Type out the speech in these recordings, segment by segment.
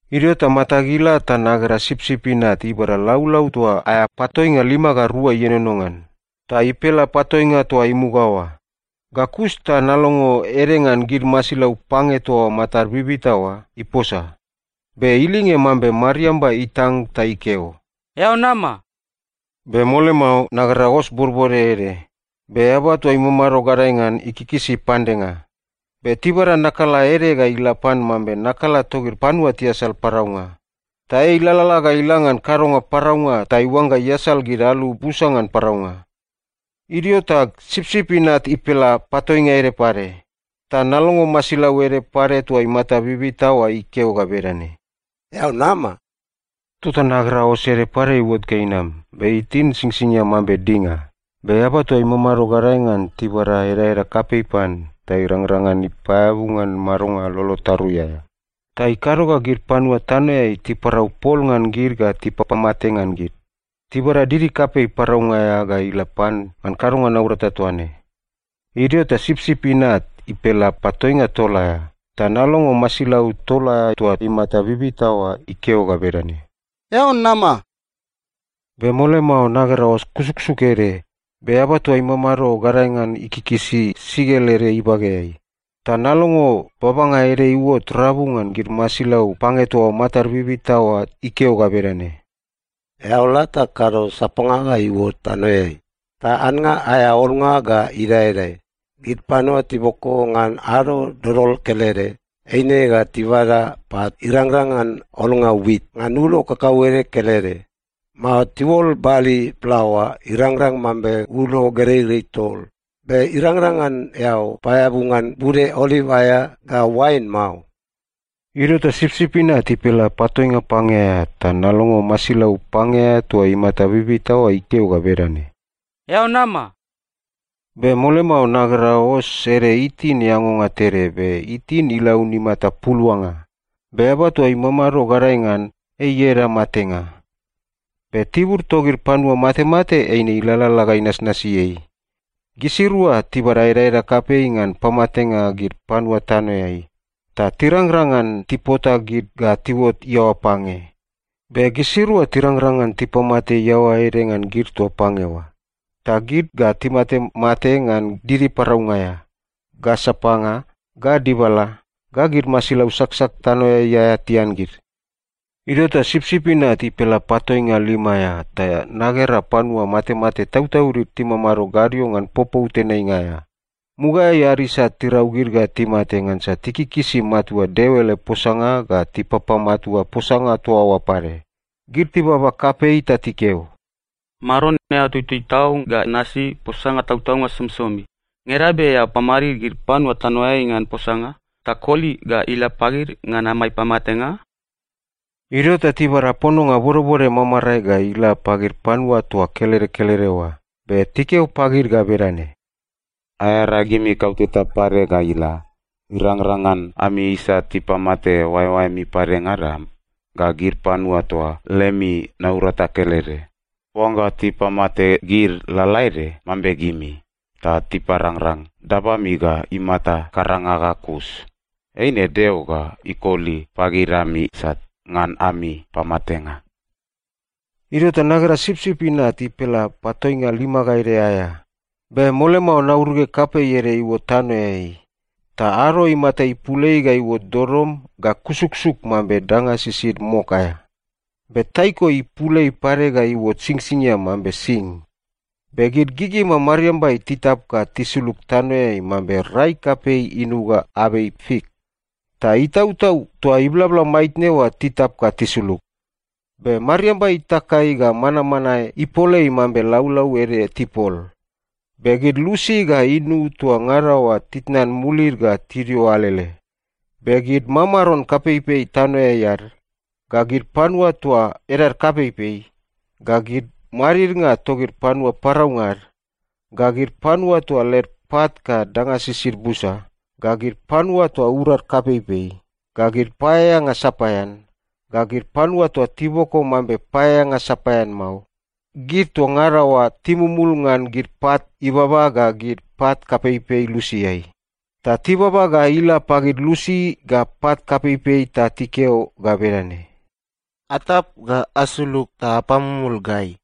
Idio ta matag ila ta nagera Sipsip Inat ibada laulau toa aea patoinga lima ga rua ienono ngan, ta ipela patoinga toa imuga oa. Ga kus ta nalongo ede ngan gid masilau pange toa matad bibita oa iposa. Be ilinge mambe mariamba itang ta ikeo, “Eao nama!” Be mole mao, nagera os bodbode ede. Be eaba toa imamado gadae ngan, ikikisi pandenga. Be tibada nakala ede ga ila pan mambe nakala togid panua tiasal paraunga. Ta ei ilalala ga ila ngan kadonga paraunga ta iuangga iasal gid alu busa ngan paraunga. Idio ta Sipsip Inat ipela patoinga ede pade, ta nalongo masilau ede pade toa imata bibita oa ikeo ga bedane, “Eao nama!” Tota nagera os ede pade iuot ga inam, be itin singsingia mambe dinga. Be eaba toa imamado gadae ngan, tibada edaeda kapei pan ta irangrang ngan ipaeabu ngan madonga lolo tarui aea. Ta ikado ga gid panua tanoeai tiparau pol ngan gid ga tipapamate ngan gid. Tibada didi kapei paraunga aea ga ila pan ngan kadonga naurata toa ne. Idio ta Sipsip Inat ipela patoinga tol aea, ta nalongo masilau tol aea toa imata bibita oa ikeo ga bedane, “Eao nama!” Be mole mao nagera os kusuksuk ede, be eaba toa imamado gadae ngan ikikisi sikel ede ibageai. Ta nalongo babanga ede iuot rabu ngan gid masilau pange toa matad bibita oa ikeo ga bedane, “Eao la ta kado sapanga ga iuot tanoeai. Ta annga aea olnga ga idaedae. Gid panua tiboko ngan ado dodol kelede, eine ga tibada pat irangrang ngan olnga wit ngan ulo kakauede kelede, mao tiuol bali plaoa irangrang mambe ulo gereirei tol. Be irangrang ngan eao paeabu ngan bude oliv aea ga oain mao.” Idio ta Sipsip Inat ipela patoinga pange aea, ta nalongo masilau pange aea toa imata bibita oa ikeo ga bedane, “Eao nama!” Be mole mao nagera os ede itin eangonga tede, be itin ilaun imata puluanga. Be eaba toa imamado gadae ngan, ei ieda Matenga. Be Tibur togid Panua Matemate eine ilalala ga inasnasi ei. Gisirua tibada edaeda kapei ngan pamatenga gid panua tanoeai. Ta tirangrang ngan tipota gid ga tiuot iaoa pange. Be gisirua tirangrang ngan tipamate iaoa ede ngan gid toa pange oa. Ta gid ga timatemate ngan didi paraunga aea, ga sapanga, ga dibala, ga gid masilau saksak tanoeai aea tian gid. Idio ta Sipsip Inat ipela patoinga lima aea, ta nagera panua matemate tautaudid timamado gadio ngan popou tenainga aea. Mugaeai ad isat tirau gid ga timate ngansa tikikisi matua Deo ele posanga ga tipapamatua posanga toa oa pade. Gid tibaba kapei ta tikeo, “Maron, eao tutui tau ga nasi posanga tautaunga somisomi. Ngeda be eao pamadid gid panua tanoeai ngan posanga ta koli ga ila pagid ngan amai pamatenga?” Idio ta tibada pononga bodbode mamarae ga ila pagid panua toa kelede kelede oa. Be tikeo pagid ga bedane, “Aearagimi kauteta pade ga ila irangrang ngan ami isat tipamate oaeoaemi padengada ga gid panua toa lemi naurata kelede. Oangga tipamate gid lalaede mambe gimi, ta tiparangrang dabami ga imata karanga ga kus, eine Deo ga ikoli pagid ami isat ngan ami pamatenga.” Idio ta nagera Sipsip Inat ipela patoinga lima ga ede aea. Be mole mao nauruge kapei ede iuot tanoeai, ta ado imata ipul ei ga iuot dodom ga kusuksuk mambe danga sisid mok aea. Be taiko ipul ei pade ga iuot singsingia mambe sing. Be gid gigima mariambai titap ga tisulug tanoeai mambe rai kapei inuga abei fik ta itautau toa iblabla maitne oa titap ga tisulug. Be mariamba itakai ga manmanae ipolei mambe laulau ede tipol. Be gid lusi ga inu toa ngada oa titnan mulid ga tidio alele. Be gid mamaron kapeipei tanoeai ad, ga gid panua toa edad kapeipei, ga gid madidnga togid panua paraunga ad, ga gid panua toa led pat ga danga sisid busa, ga gid panua toa urad kapeipei, ga gid paeaeanga sapaean, ga gid panua toa tiboko mambe paeaeanga sapaean mao, gid toa ngada oa timumul ngan gid pat ibaba ga gid pat kapeipei lusiai. Ta tibaba ga ila pagid lusi ga pat kapeipei ta tikeo ga bedane, “Atap ga asulug ta apamumul gai!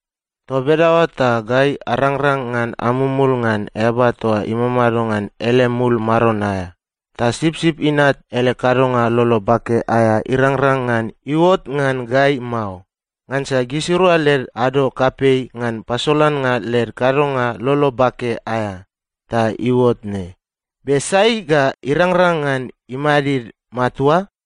Toa bedaoa ta gai arangrang ngan amumul ngan Eaba toa imamado ngan ele mul maron aea, ta Sipsip Inat ele kadonga lolo bake aea irangrang ngan iuot ngan gai mao. Ngansa gisirua led ado kapei ngan pasolannga led kadonga lolo bake aea, ta iuot ne. Be sai ga irangrang ngan imadid matua?”